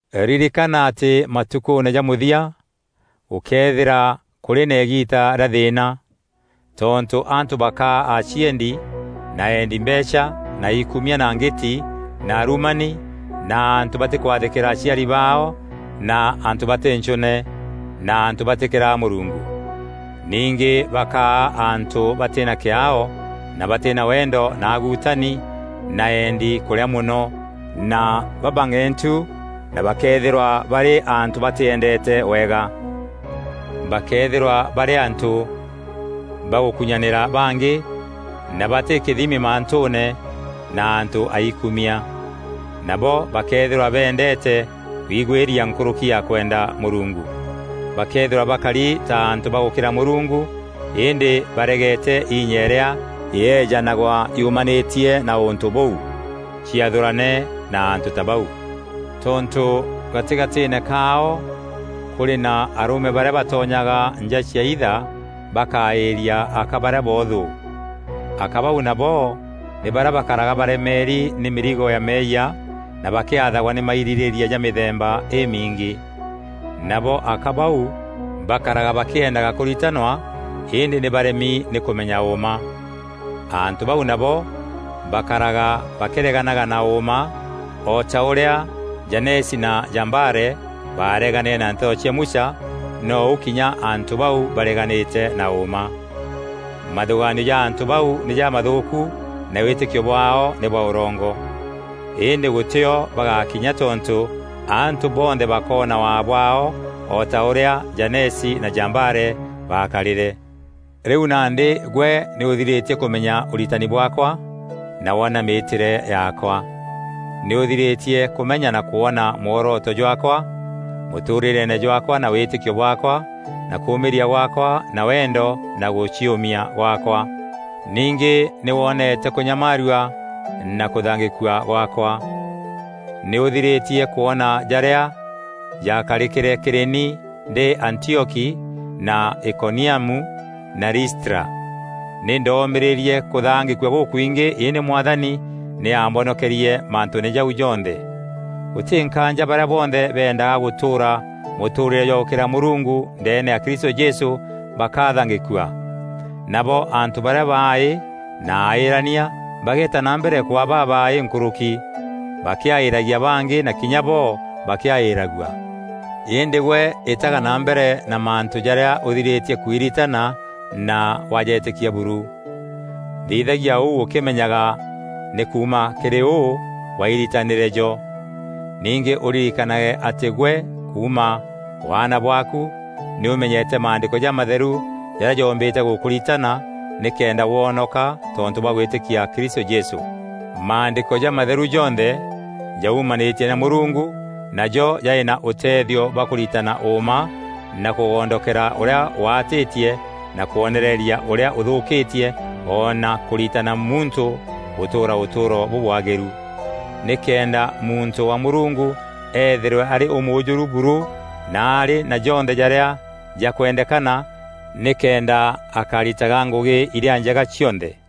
Ririkana atî matukûûne ja mûthia, gûkeethîra kûrî na îgiita rîa thîîna. Tontû antû bakaa aciendi na eendi mbeecha na aikumia na ngîti na arumani na antû batîkwathîkîra aciari baao na antû batî nchûne na antû batîkîraga Mûrungu. Ningî bakaa antû batî na kîaao na batî na wendo na aguutani na eendi kûrîa mono na babang'entu na bakeethîrwa barî antû batîendeete wega. Bakeethîrwa barî antû bagûkunyanîra bangî na batî kîthimi mantûûne na antû aikumia. Nabo bakeethîrwa bendeete kwigwîria nkûrûki ya kwenda Mûrungu. Bakeethîrwa bakari ta antû bagûkîra Mûrungu îndî baregeete inya îrîa yeejanagwa yumanîtie na ûntû bûu. Ciathûrane na antû ta bau. Tontû gatîgatîîne kaao kûrî na arûme barîa batonyaga nja ciaitha bakaîria aka barîa boothû. Aka bau nabo nî barîa bakaraga baremeeri nî mîrigo ya meeyia na bakîathagwa nî mairîrîîria ja mîthemba îmiingî. Nabo aka bau bakaraga bakîeendaga kûritanwa îndî nî baremi nî kûmenya ûûma. Antû bau nabo bakaraga bakîreganaga na ûûma o ta ûrîa Janesi na Jambare bareganîre na nteto cia Musa, nou kinya antû bau bareganîte na ûûma. Mathûgaanio ja antû bau nî jamathûûku na wîtîkio bwaao nî bwa ûrongo. Îndî gûtîo bagakinya tontû antû bonthe bakoona waa bwaao o ta ûrîa Janesi na Jambare bakarîre. Rîu nandî gwe nî ûthirîtie kûmenya ûritani bwaakwa na wona mîîtîre yaakwa. Nî ûthirîtie kûmenya na kwona mworoto jwaakwa mûtûûrîreene jwaakwa na wîtîkio bwaakwa na kûmîîria gwaakwa na wendo na gûciûmia gwaakwa. Ningî nî wonete kûnyamaarua na kûthangîkua gwaakwa. Nî ûthirîtie kwona jarîa jakarîkîre kîrî ni ndî Antioki na Ikoniamu na Listra. Nî ndomîrîîrie kûthangîkua gûkwingî îndî Mwathani nî aambonokerie mantûûne jau jonthe. Gûtî nkaanja barîa bonthe bendaga gûtûûra mûtûûrîre jwa gûkîra Mûrungu ndeene ya Kristû Jesû bakathangîkua. Nabo antû barîa baaî na aîîrania bageeta na mbere kwaa babaaî nkûrûki, bakîaîîragia bangî na kinya bo bakîaîragua. Îndî gwe îtaga na mbere na mantû jarîa ûthirîtie kwiritana na wajetîkia buru. Thithagia ûu ûkîmenyaga nî kuuma kîrî ûû wairitanîre jo. Ningî ûririkane atî gwe kuuma waana bwaaku nî ûmenyete Maandîko jamatheru jarîa joombîte gûkûritana nîkenda wonoka tontû bwa gwîtîkia Kristû Jesû. Maandîko jamatheru jonthe jaumanîtie na Mûrungu najo jarî na ûteethio bwa kûritana ûûma na kûgondokera ûrîa waatîtie na kwonereria ûrîa ûthûûkîtie o na kûritana muntû gûtûûra ûtûûro bûbwagîru, nîkenda muntû wa Mûrungu eethîrwe arî ûmûûjûru buru na arî na jonthe jarîa jakwendekana nîkenda akaritaga ngûgî irîa njega cionthe.